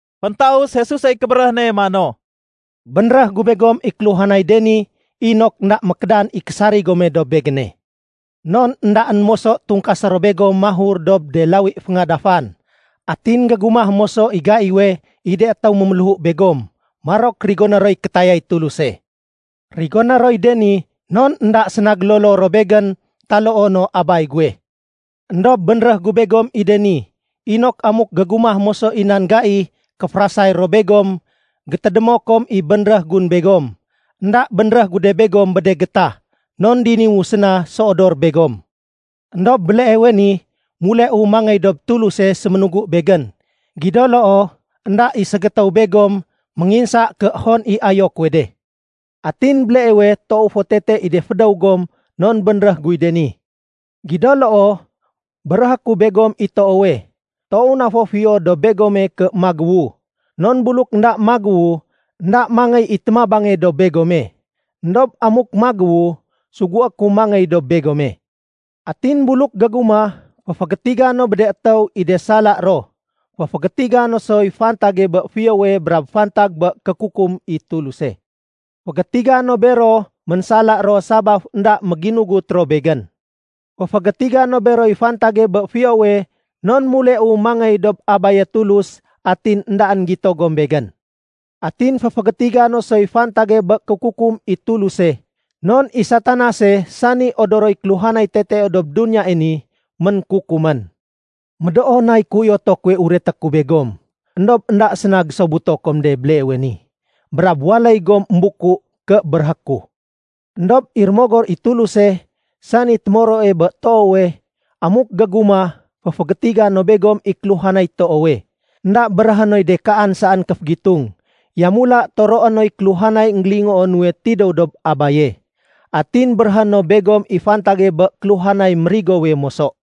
Féntaus Jesusey kébéréh ne mano, “Bénréh gu begom i kéluhanay de ni inok énda mékédan i késarig gome dob Begéne. Non éndaén moso tungkasé ro begom mahur dob de lawi féngadafan. Atin gégumah moso i gaiwe, i de étéw méméléhu begom, marok rigoné roy kétayay Tuluse. Rigoné roy de ni non énda séna gélolo ro Begén taloo no Abay guwe. Endob bénréh gu begom i de ni, inok amuk gégumah moso i nan gai kéférasay ro begom, gétédémo kom i bénréh gun begom. “Enda bénréh gu de begom bé de gétah, non diniwu séna séodor begom. Endob béleewe ni, muleu mangéy dob Tuluse séménugu Begén. Gido loo, énda i ségétéw begom ménginsa ké hon i ayo kuwe de. Atin béleewe, toow fo tete i de fédéw gom non bénréh guy de ni. Gido loo, béréhé ku begom i toowe, toow na fo fiyo dob begome ké magéwu, non buluk énda magéwu énda mangéy i témabange dob begome. Endob amuk magéwu, sugué ku mangéy dob begome. Atin buluk gégumah, féfégétiga no bé de étéw i de sala ro. Féfégétiga no soy fantage bé fiyowe brab fantag bé kékukum i Tuluse. Fégétiga no bero ménsala ro sabaf énda méginugut ro Begén. Féfégétiga no beroy fantage bé fiyowe non muleu mangéy dob Abaye Tulus, atin éndaén gito gom Begén. Atin féfégétiga no soy fantage bé kékukum i Tuluse, non i Satanase, sani odoroy kéluhanay tetee dob duniyae ni, ménkukumén. “Médoo nay kéuyoto kuwe ureté ku begom, éndob énda séna gésobuto kom de béleewe ni, brab waléy gom émbuku ké béréhé ku. Endob i Rémogor i Tuluse, sani témoroe bé toowe, amuk gégumah, féfégétiga no begom i kéluhanay toowe. Enda béréhé noy de kaan saén kéfégitung, yamula toroé noy kéluhanay énggélingoo nuwe tidéw dob Abaye, atin béréhé no begom i fantage bé kéluhanay mérigowe moso.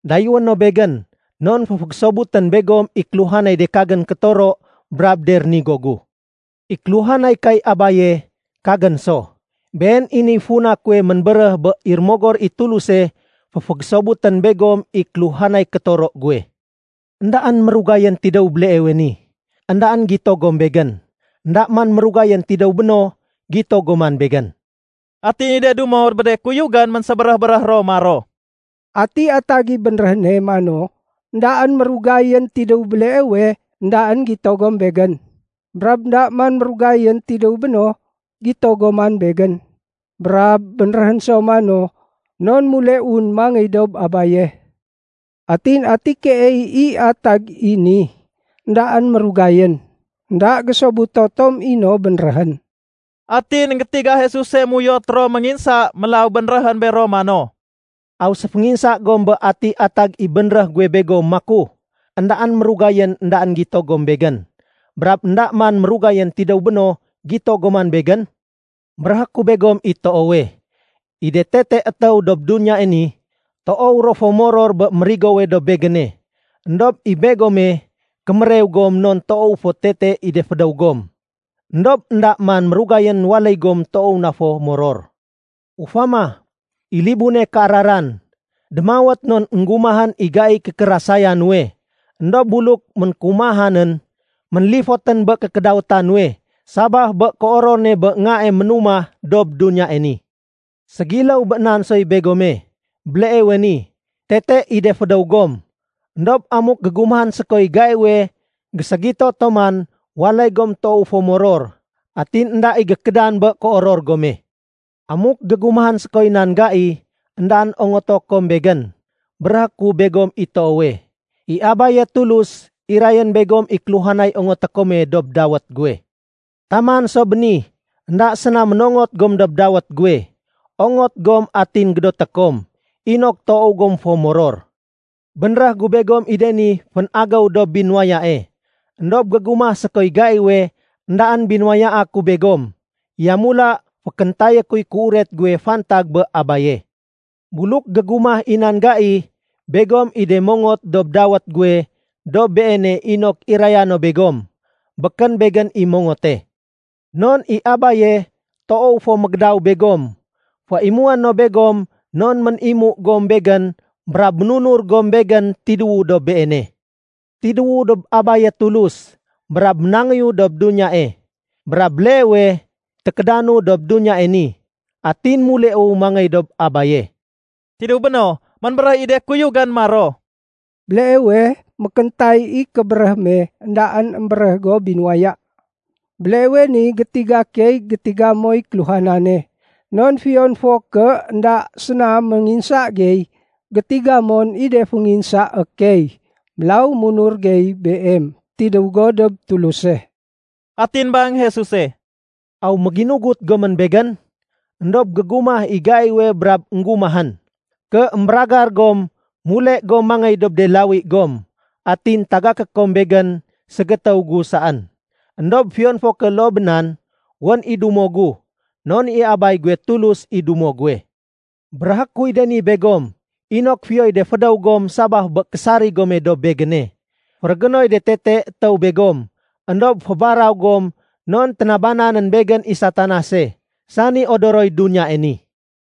Dayéwé no Begén, non féfégésobutén begom i kéluhanay de kagén kétoro brab de rénigo gu. I kéluhanay kay Abaye, kagén so. Been i niy funa kuwe ménbéréh bé i Rémogor i Tuluse, féfégésobutén begom i kéluhanay kétoro guwe. “Endaén mérugayén tidéw béleewe ni, éndaén gito gom Begén. Enda man mérugayén tidéw béno, gito gom man Begén.” Atin i de dumo bé de kuyugén ménsébéréh-béréh ro maro, “Ati atag i bénréh ne mano, ‘Endaén mérugayén tidéw béleewe, éndaén gito gom Begén, brab énda man mérugayén tidéw béno, gito gom man Begén?’ Brab bénréhén so mano, ‘Non muleun mangéy dob Abaye.’ Atin ati keey i atag i ni, ‘Endaén mérugayén’? Enda gésobuto tom i no bénréhén.” Atin énggétiga Jesuse méuyot ro ménginsa, mélaw bénréhén bero mano, “Aw séfénginsa gom bé ati atag i bénréh guwe begom maku, ‘Endaén mérugayén éndaén gito gom Begén, brab énda man mérugayén tidéw béno gito gom man Begén?’ Béréhé ku begom i toowe, i de tete étéw dob duniyae ni, toow ro fo moror bé mérigowe dob Begéne, éndob i begome, kémérew gom non toow fo tete i de fédéw gom. Endob énda man mérugayén waléy gom toow na fo moror. Ufama, i libune kéararan, démawét non énggumahén i gaiy kékérasaya nuwe. Endob buluk ménkéumahanén, ménlifotén bé kékédawéta nuwe, sabaf bé kéoror ne bé ngae ménumah dob duniyae ni. Ségiléw bé nan soy begome. Béleewe ni, tete i de fédéw gom. Endob amuk gégumahén sékoy gaiwe géségito tom man, waléy gom toow fo moror. Atin énda i gékédan bé kéoror gome. “Amuk gégumahén sékoy nan gai, éndaén ongoto kom Begén. Béréhé ku begom i toowe, i Abaye Tulus, irayén begom i kéluhanay ongoté kome dob dawét guwe. Taman so béni, énda séna ménongot gom dob dawét guwe. Ongot gom atin gédoté kom, inok toow gom fo moror. “Bénréh gu begom i de ni fénagéw dob binuwayae. Endob gégumah sékoy gaiwe éndaén binuwayaa ku begom, yamula fékéntayé kuy kéuret guwe fantag bé Abaye. Buluk gégumah i nan gai, begom i de mongot dob dawét guwe dob Beene inok iraya no begom. Békén Begén i mongote. Non i Abaye toow fo mégédaw begom. Féimué no begom non ménimu gom Begén brab ménunur gom Begén tidéwu dob Beene. Tidéwu dob Abaye Tulus, brab ménangéyu dob duniyae. Brab béleewe tékédanu dob duniyae ni, atin muleu mangéy dob Abaye.” Tidéw béno, ménbéréh i de kuyugén maro, “Béleewe mékéntay i kébéréh me, éndaén émbéréh go binuwaya. Béleewe ni gétiga key gétiga moy kéluhanane, non fiyon fo ké énda séna ménginsa gey, gétiga mon i de fénginsaé key. Mélaw munur gey Beem, tidéw go dob Tuluse.” Atin bang Jesuse, “Aw méginugut gomén Begén? Endob gégumah i gaiwe brab énggumahén, ké émbéragar gom, mule gom mangéy dob de lawi gom. Atin tagaké kom Begén ségétéw gu saén. Endob fiyon fo ké loo bé nan, wén i dumo gu, non i Abay guwe Tulus i dumo guwe. Béréhé kuy de ni begom, inok fiyoy de fédéw gom sabaf bé késarig gome dob Begéne. Férégénoy de tete étéw begom, éndob fébaraw gom non ténabananén Begén i Satanase, sani odoroy duniyae ni.”